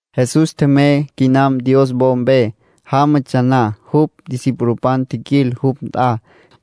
Jesús tjemey quinam Dios wo mpe. Jámatsja na, jupj discipulopan tjiquil jupj nt'a.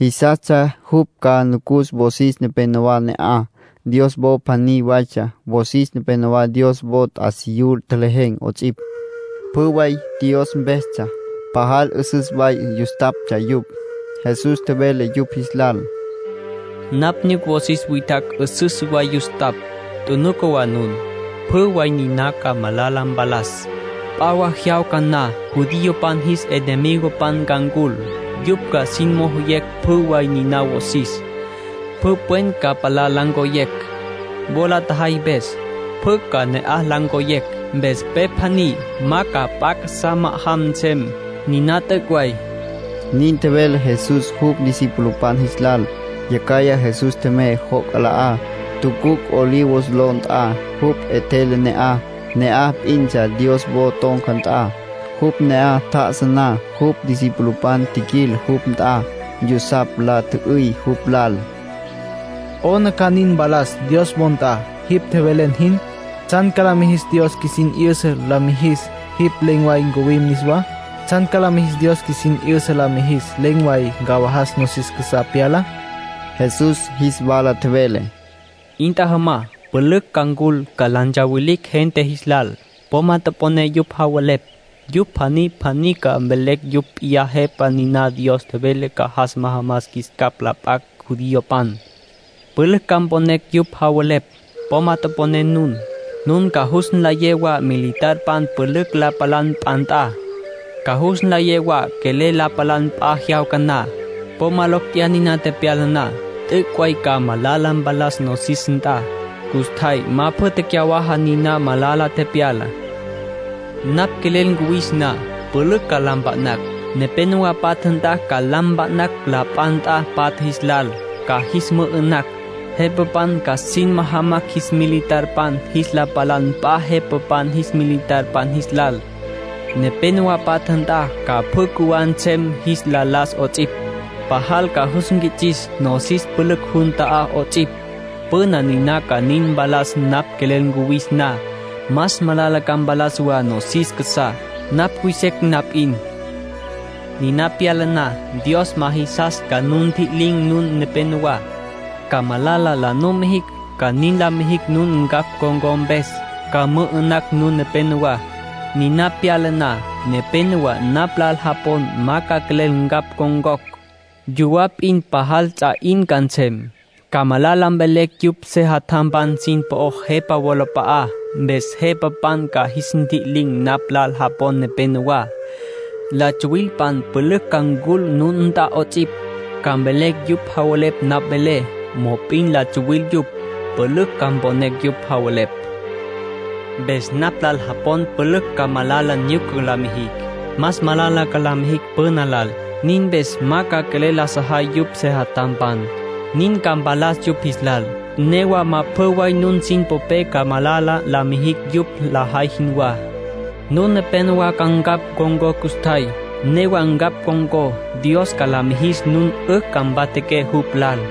Jisastsja jupj ca nucus wosis nepenowá ne'aj. Dios wo pjaní waytsja, wosis nepénowa Dios wo t'asiyú tjelejen̈ 'ots'ipj. Pjü way Dios mpestsja. Pajal 'üsüs way yustaptsja yupj. Jesús tjevele yupj jis lal: —Napj nyuc wosis witjacj 'üsüs way yustapj. Tjunuca wa nun. Pjü way niná ca malala mpalas. P'a jyawca na judiopan jis enemigopan ca ncul. Yupj ca sin mojoyecj pjü way niná wosis. Pjü pwen ca palá la ncoyecj, wo la tjajay mpes. Pjü ca na'aj la ncoyecj, mpes pe pjaní ma ca p'a casá ma'ajam nsem. Niná t'üc' way —nin tjevele Jesús jupj discipulopan jis lal. Yacjaya Jesús tjemey joc' 'ala'á, tucuc' Olivos ló nt'a. Jupj 'etjele ne'aj. Ne'aj p'intsja Dios wo ton̈ca nt'a. Jupj ne'aj tjá'asa na, jupj discipulopan tjiquil jupj nt'a yusapj. La tjü'üy jupj lal: —¿'Ona ca nin mpalas Dios wo nt'a, jipj tjevelen jin? ¿Tsjan ca la mijis Dios qjuisin 'yüsa la mijis jipj len̈ way ncuwim niswá? ¿Tsjan ca la mijis Dios qjuisin 'yüsa la mijis len̈ way ncawajas nosis casá pyalá? Jesús jis wala tjevele: —'In tjajama. Pülücj ca ncul, ca la ntsawilicj gente jis lal. Po ma toponé yupj javelepj. Yupj pjaní pjaní ca mvelecj yupj p'iyá Jepa niná Dios tjevele ca jas majamas jis capj la p'acj judiopan. Pülücj ca mponecj yupj javelepj. Po ma toponé nun. Nun ca jus nlayé wa militarpan pülücj la palan p'a nt'a. Ca jus nlayé wa quelel la palan p'a jyawca na. Po ma locj tjeyá niná tepyala na. T'üc' way ca malala mpalas nosis nt'a. Custjay ma pjü tecyawaja niná malala tepyalá. Napj quelel cuwis na, ca pülücj la mpa'nacj. Nepénowa patja nt'a la mpa'nacj ca p'a nt'a patja jis lal. Ca jis mü'ü'nacj. Jepapan ca sin majamacj jis militarpan jis la palan p'a jepapan jis militarpan jis lal. Nepénowa patja nt'a ca pjü cjuwá nsem jis la las 'ots'ipj. Pajal ca jus nquits'is nosis pülücj jun ta'á 'ots'ipj. Pjü niná ca nin mpalas napj quelel cuwis na. Más malala ca mpalas wa nosis casá, napj cuy secj na p'in. ”Niná pyala na, Dios ma jisas ca nu ntji'lin̈ nun nepenowá, ca malala la numijicj. Ca nin la mijicj nun ncapj con̈có mpes. Ca mü'ü'nacj nun nepenowá. Niná pyala na, nepénowa napj lal japon ma ca quelel ncapj ncon̈cocj. Yuwá p'in pajal ts'a 'in ca nsem. Ca malala mvelecj yupj sejatjampan sin po'ó jepa wolap'a'á, mpes jepapan ca jis ntji'lin̈ napj lal japon nepenowá. La tsuwilpan pülücj ca ncul nun nt'a 'ots'ipj. Ca mvelecj yupj javelepj napj velé, mop'in la tsuwil yupj. Pülücj ca mponecj yupj javelepj. Mpes napj lal japon pülücj ca malala nyuca la mijicj. Más malala ca la mijicj püna lal. Nin mpes ma ca quelel la sajay yupj sejatjampan. Nin ca mpalas yupj jis lal. Newa ma pjü way nun sin popé ca malala la mijicj yupj lajay jinwá. Nun nepénowa ca ncapj ncon̈có custjay. Newa ncapj con̈có, Dios ca la mijis nun 'ücj ca mpatjaqué jupj lal.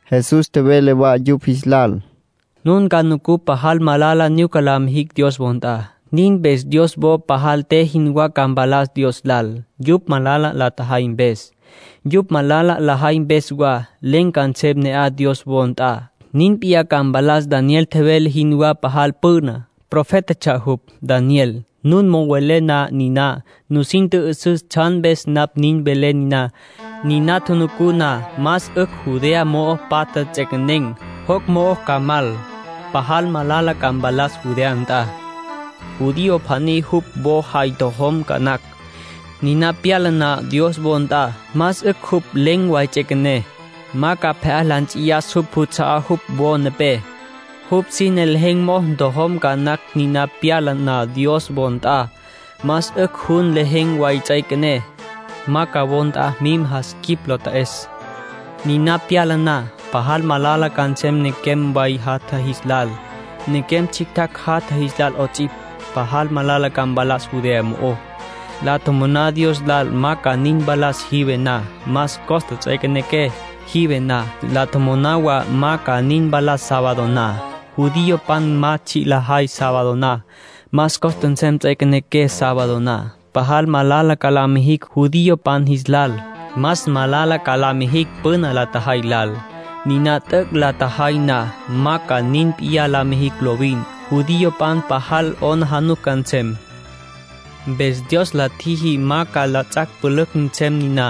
Jesús tjevele wa yupj jis lal: —Nun ca nucú pajal malala nyuca la mijicj Dios wo nt'a. Nin mpes Dios wo pajal te jinwá ca mpalas Dios lal, yupj malala la tjajay mpes. Yupj malala lajay mpes wa, len̈ ca nsem ne'aj Dios wo nt'a. Nin p'iyá ca mpalas Daniel tjevele jinwá pajal püna. Profétatsja jupj, Daniel. Nun mo'o welé na niná, nusin tjü'üsüs tsjan mpes napj nin velé niná. Niná tjunucú na más 'ücj Judea mo'o patja ts'equenen̈, joc' mo'o ca mal. Pajal malala ca mpalas Judea nt'a. Judío pjaní jupj wo jay ntojom ca nacj, niná pyala na Dios wo nt'a. Más 'ücj jupj len̈ way ts'üequené. Ma ca pje'á la nts'iyas jupj juts'a'á jupj wo nepé. Jupj sine lejen̈ mo'o ntojom ca nacj niná pyala na Dios wo nt'a. Más 'ücj jupj len̈ way ts'üequené. Ma ca wo nt'a mim jas quip lo ta'es. ”Niná pyala na, pajal malala ca nsem nequem way jatja jis lal, nequem tsjictjacj jatatj jis lal 'ots'ipj. Pajal malala ca mpalas Judea mo'ó. La tjomoná Dios lal ma ca nin mpalas jive na. Más costa ts'üequenequé jive na. La tjomoná wa ma ca nin mpalas sábado na. Judiopan ma tsji' lajay sábado na. Más costa nsem ts'üequenequé sábado na. Pajal malala ca la mijicj judiopan jis lal. Más malala ca la mijicj püna la tjajay lal. Niná t'üc' la tjajay na, ma ca nin p'iyá la mijicj lovin. Judiopan pajal 'aplijila ca nsem. ”Mpes Dios la tjiji ma ca ts'ac' pülücj nsem niná.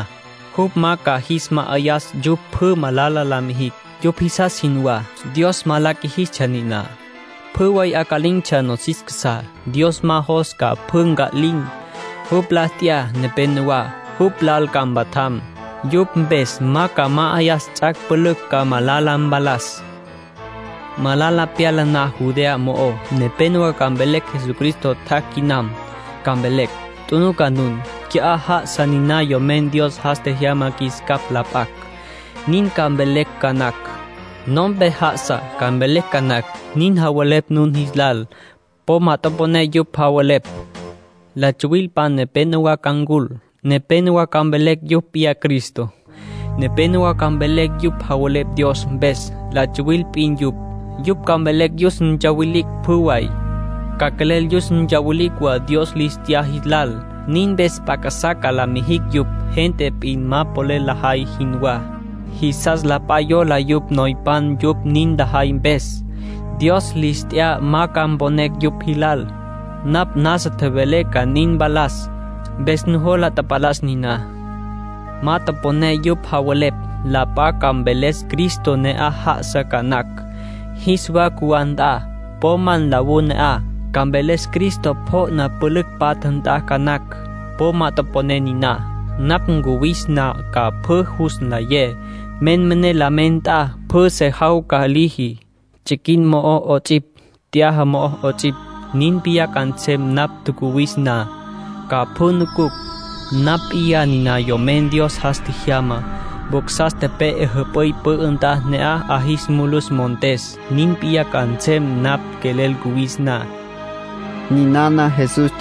Jupj ma ca jis ma'ayas yupj pjü malala la mijicj, yupj jisas jinwá. Dios ma la qjuijistsja niná, pjü way 'aca'lin̈tsja nosis casá. Dios ma jos ca pjü nca'lin̈. Jupj la t'ya nepenowá, jupj lal ca mpatjam. Yupj mpes ma ca ma'ayas ts'ac' pülücj ca malala mpalas. ”Malala tepyala na Judea mo'ó, nepénowa ca mvelecj Cristo tjac' quinam. Ca mvelecj: ‘Tjunuca nun. Qui'á já'asa niná Yomen Dios jas tjejyama qjuis capj la p'acj.’ Nin ca mvelecj ca nacj. ‘No'ompe já'asa’, ca mvelecj ca nacj. Nin javelepj nun jis lal, po ma toponé yupj javelepj. La tsuwilpan nepénowa ca ncul. Nepénowa ca mvelecj yupj p'iyá Cristo. Nepénowa ca mvelecj yupj javelepj Dios mpes. La tsuwil p'in yupj. Yupj ca quelel yus ntsawilicj pjü way. Ca quelel yus ntsawilicj wa Dios lis t'ya jis lal. Nin mpes p'a casá ca la mijicj yupj, gente p'in ma polel lajay jinwá. Jisas la p'a yola yupj noypan yupj nin lajay mpes. Dios lis t'ya ma ca mponecj yupj jilal. Napj nasa tjevelé ca nin mpalas. Mpes nujola tapalas niná. ”Ma toponé yupj javelepj. La p'a ca mveles Cristo ne'aj já'asa ca nacj, jis wa cjuwá nt'a. Po ma nlawú ne'aj. Ca mveles Cristo pjo'na pülücj patja nt'a ca nacj. Po ma toponé niná. Napj cuwis na ca pjü jus nlayecj. Menmené la mena nt'a pjü se jawca liji, tsiquin mo'ó 'ots'ipj, t'yaja mo'ó 'ots'ipj. Nin p'iyá ca nsem napj tjacuwis na. Ca pjü nucucj. Napj p'iyá niná Yomen Dios jas tjejyamá. Vaca tepe'e jüp'üy pü'ü nt'a, ne'aj 'a jis mulus montes. Nin p'iyá ca nsem napj quelel cuwis na —nin tjevele Jesús.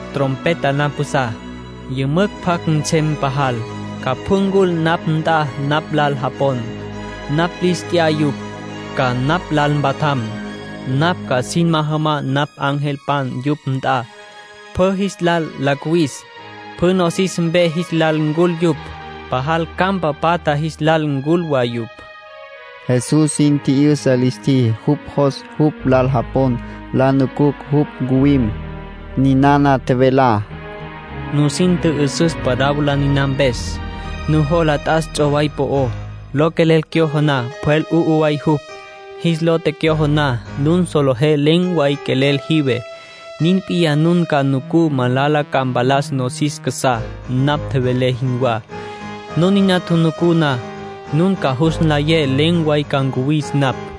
Trompeta la mpjusá. Yümücj pjac nsem pajal, ca pjü ncul napj nt'a napj lal japon. Napj lis t'ya yupj, ca napj lal mpatjam. Napj ca sin majam napj angelpan yupj nt'a, pjü jis lal la cuwis. Pjü nosis mpe jis lal ncul yupj. Pajal campa patja jis lal ncul wa yupj —nin tjevele Jesús. Jesús sin tji'yüsa lis tjiji jupj jos jupj lal japon la nucucj jupj ncuwim. Ninana tjevelá: —Nusin tjü'üsüs parábola niná mpes. Nujola t'as ts'oway po'ó. Lo quelel cyojo na, pjwel 'u'u way jupj. Jis lo tecyojo na, nun solejé len̈ way quelel jive. Nin p'iyá nun ca nucú malala ca mpalas nosis casá, napj tjevelé jinwá. Nun niná tjunucú na, nun ca jus nlayé len̈ way ca ncuwis napj.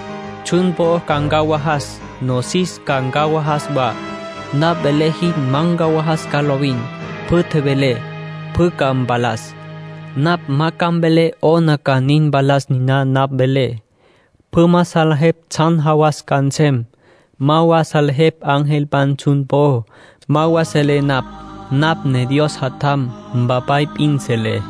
Tsjun po'ó ca ncawajas, nosis ca ncawajas wa. Napj velé jin ma ncawajas ca lovin. Pjü tjevelé, pjü ca mpalas. ”Napj ma ca mvelé 'ona ca nin mpalas niná napj velé. Pjü ma salejepj tsjan jawas ca nsem. Ma wa salejepj angelpan tsjun po'ó. Ma wa selé napj. Napj ne Dios Jatjam. Mpapay p'in selé.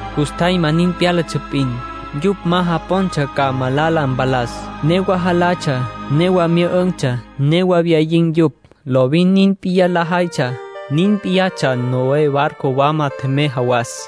Custjay ma nin pyálatsja p'in, yupj ma japontsja ca malala mpalas. Newa jalatsja, newa myü'ün̈tsja. Newa wyayin̈tsja yupj. Lovin nin p'iyá lajaytsja. Nin p'iyatsja Noé barco wama tjemey jawas.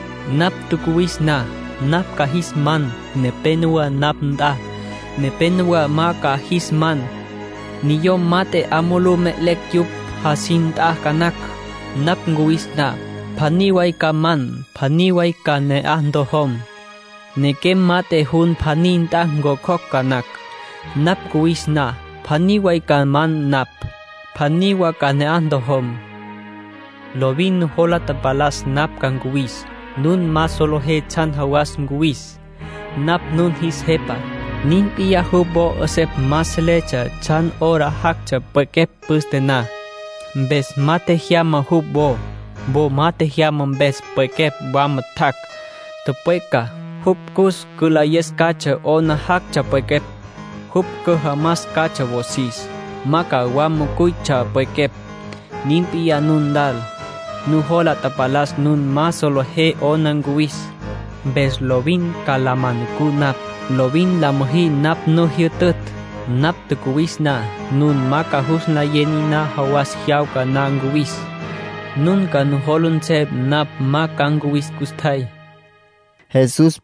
Napj cuwis na, napj ca jis man nepenowá napj nt'a. Nepénowa ma ca jis man. Niyom mat'e 'a mulú me'elecj yupj jasin nt'a ca nacj, napj cuwis na. Pjaní way ca man. Pjaní wa ca ne'aj ntojom. Nequem mat'e jun pjaní nt'a ncjocjocj ca nacj, napj cuwis na. Pjaní way ca man napj. Pjaní wa ca ne'aj ntojom. ”Lovin nujola tapalas napj ca ncuwis. Nun ma solejé tsjan jawas ncuwis. Napj nun jis Jepa. Nin p'iyá jupj wo 'esepj ma seletsja tsjan hora jactsja pwequepj püste na. Mpes ma tjejyama jupj wo. Wo ma tjejyama mpes, pwequepj wama tjac', tüpweca. Jupj jus cülayes catsja 'ona jactsja pwequepj, jupj cüjamas catsja wosis. Ma ca wama cuytsja pwequepj. Nin p'iyá nun lal. Nujola tapalas nun ma solejé 'ona ncuwis. Mpes lovin ca la ma nucú napj. Lovin la müjí napj nu tjijyütütj. Napj cuwis na, nun ma ca jus nlayé niná jawas jyawca na ncuwis. Nun ca nujola nsem napj ma ca ncuwis custjay —nin tjevele Jesús.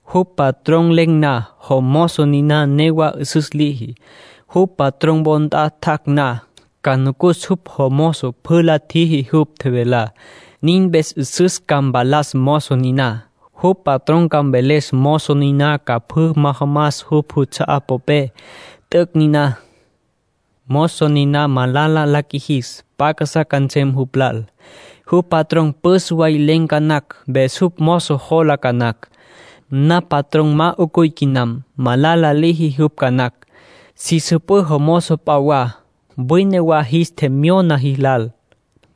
Jupj patrón len̈ na, jomozo niná newa 'üsüs liji. Jupj patrón wo nt'a tjac' na, ca nucus jupj jomozo pjü la tjiji jupj tjevelá. Nin mpes 'üsüs ca mpalas mozo niná. Jupj patrón ca mveles mozo niná ca pjü majamas jupj juts'a'á popé. T'üc' niná. ”Mozo niná malala la qjuijis, p'a casá ca nsem jupj lal. Jupj patrón püs way len̈ ca nacj. Mpes jupj mozo jola ca nacj: ‘Napj patrón ma 'ucuy quinam’. Malala liji jupj ca nacj. Si süpǘ mozopan p'a wa. Wine wa jis tjemyona jis lal.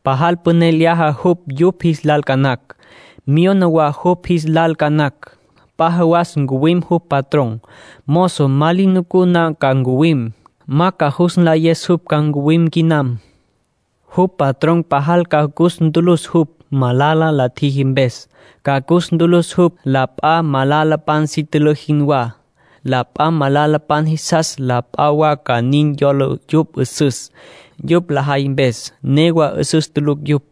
Pajal püné lyaja jupj yupj jis lal ca nacj. Myona wa yupj jis lal ca nacj. P'a jawas ncuwim jupj patrón. Mozo ma li nucú na ca ncuwim. Ma ca jus nlayes jupj ca ncuwim quinam. Jupj patrón pajal ca cus ntülüs jupj, malala la tjiji mpes. Ca cus ntülüs jupj, la p'a malalapan si tülǘ jinwá. La p'a malalapan jisastsja la p'a wa ca nin yola yupj 'üsüs, yupj lajay mpes. Newa 'üsüs tulucj yupj.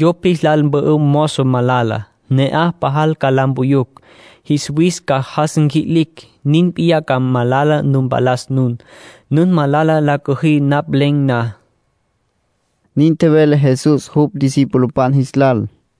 Yupj jis lal mpü'üm mozo malala. Ne'aj pajal ca la mpuyucj. Jis wis ca jas nqui'licj. Nin p'iyá ca malala nu mpalas nun, nun malala la cüjí napj len̈ na —nin tjevele Jesús jupj discipulopan jis lal.